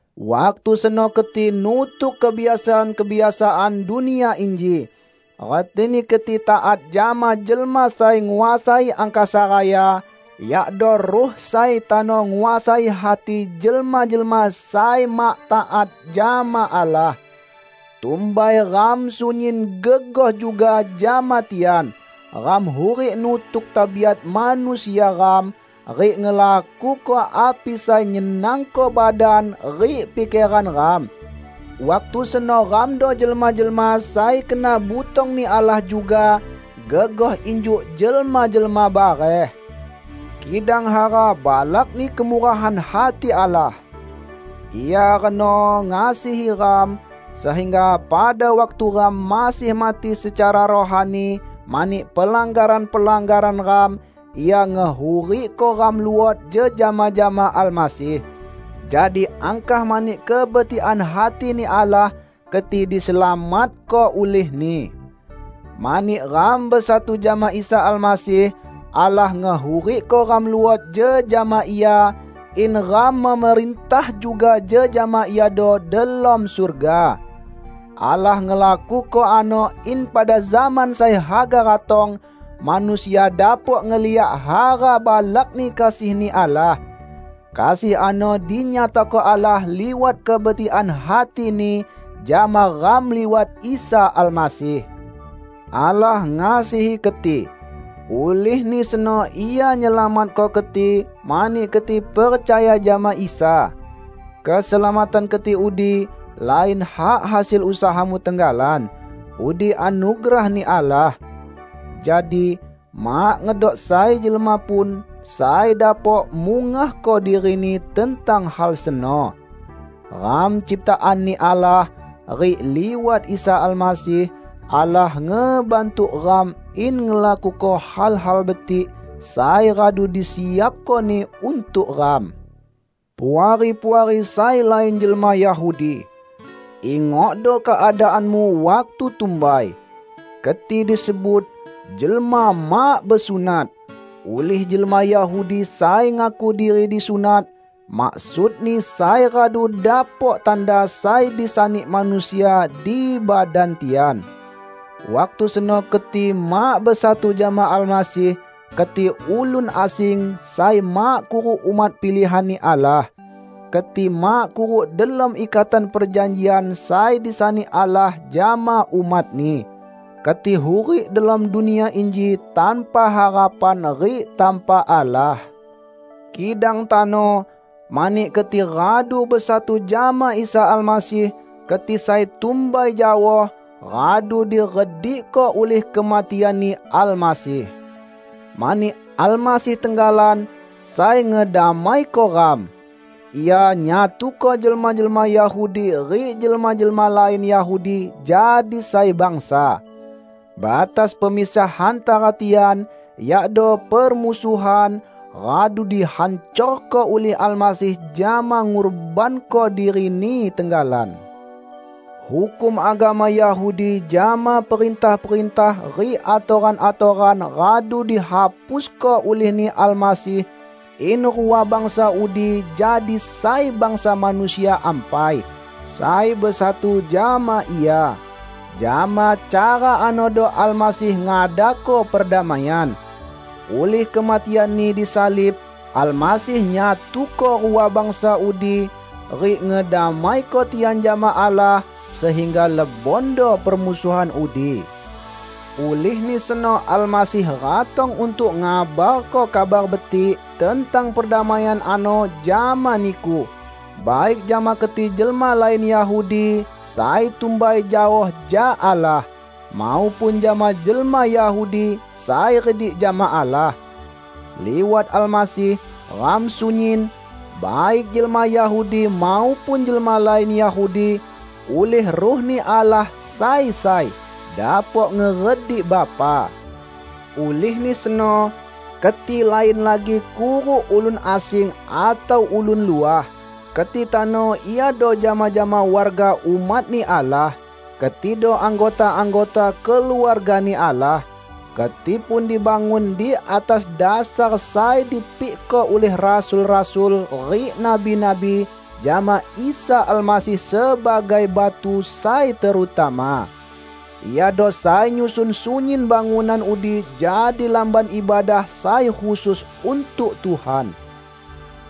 Waktu seno keti nutuk kebiasaan-kebiasaan dunia inji; retini keti taat jama jelma sai nguasai angkasa raya, yakdo ruh sai tano nguasai hati jelma-jelma sai mak taat jama Allah. Tumbai ram sunyin gegoh juga jama tian; ram hurik nutuk tabiat manusia ram, rik ngelakuko api sai nyenangko badan rik pikeran ram. Waktu seno ramdo jelma-jelma sai kena butong-Ni Allah juga, gegoh injuk jelma-jelma bareh. Kidang hara balakni kemurahan hati Allah! Ia reno ngasihi ram, sehingga pada waktu ram masih mati secara rohani mani pelanggaran-pelanggaran ram, Ia ngehurikko ram luot jejama jama Almasih. Jadi angkah mani kebetikan hati-Ni Allah, keti diselamatko ulih-Ni. Mani ram besatu jama Isa Almasih, Allah ngehurikko ram luot jejama Ia, in ram memerintah juga jejama Iado delom surga. Allah ngelakuko ano in pada zaman sai haga ratong, manusia dapok ngeliak hara balakni kasih-Ni Allah. Kasih ano dinyatako Allah liwat kebetikan hati-Ni jama ram liwat Isa Almasih. Allah ngasihi keti, ulihni seno Ia nyelamatko keti mani keti percaya jama Isa. Keselamatan keti udi lain hak hasil usahamu tenggalan. Udi anugerah-Ni Allah. Jadi, mak ngedok sai jelma pun sai dapok mungahko dirini tentang hal seno. Ram ciptaan-Ni Allah, rik liwat Isa Almasih, Allah ngebantuk ram in ngelakuko hal-hal betik sai radu disiapko-Ni untuk ram. Puari-puari sai lain jelma Yahudi! Ingokdo keadaanmu waktu tumbai: Keti disebut "jelma mak besunat", ulih jelma Yahudi sai ngaku diri disunat (maksudni sai radu dapok tanda sai disani manusia di badan tian). Waktu seno keti mak besatu jama Almasih, keti ulun asing sai mak kuruk umat pilihan-Ni Allah. Keti mak kuruk delom ikatan perjanjian sai disani Allah jama umat-Ni. Keti hurik delom dunia inji tanpa harapan rik tanpa Allah. Kidang tano, mani keti radu besatu jama Isa Almasih, keti sai tumbai jaoh, radu diredikko ulih kematian-Ni Almasih. Mani Almasih tenggalan, sai ngedamaiko ram. Ia nyatuko jelma-jelma Yahudi rik jelma-jelma lain Yahudi jadi sai bangsa. Batas pemisah hantara tian, yakdo permusuhan, radu dihancorko ulih Almasih jama ngurbanko diri-Ni tenggalan. Hukum agama Yahudi jama perintah-perintah rik atoran-atoran radu dihapusko ulih-Ni Almasih in rua bangsa udi jadi sai bangsa manusia ampai, sai besatu jama Ia. Jama cara anodo Almasih ngadako perdamaian. Ulih kematian-Ni disalib, Almasih nyatuko rua bangsa udi, rik ngedamaiko tian jama Allah, sehingga lebondo permusuhan udi. Ulihni seno Almasih ratong untuk ngabarko Kabar Betik tentang perdamaian ano jama niku, baik jama keti jelma lain Yahudi sai tumbai jaoh jak Allah, maupun jama jelma Yahudi sai redik jama Allah. Liwat Almasih, ram sunyin -- baik jelma Yahudi maupun jelma lain Yahudi -- ulih Ruh-Ni Allah sai sai, dapok ngeredik Bapa. Ulihni seno, keti lain lagi kuruk ulun asing atau ulun luah. Keti tano iado jama-jama warga umat-Ni Allah. Ketido anggota-anggota keluarga-Ni Allah. Keti pun dibangun di atas dasar sai dipikko ulih rasul-rasul rik nabi-nabi, jama Isa Almasih sebagai batu sai terutama. Iado sai nyusun sunyin bangunan udi jadi Lamban Ibadah sai khusus untuk Tuhan.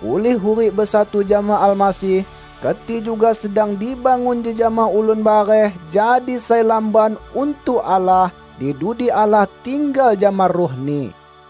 Ulih hurik besatu jama Almasih, keti juga sedang dibangun jejama ulun bareh jadi sai lamban untuk Allah; di dudi Allah tinggal jama Ruh-Ni.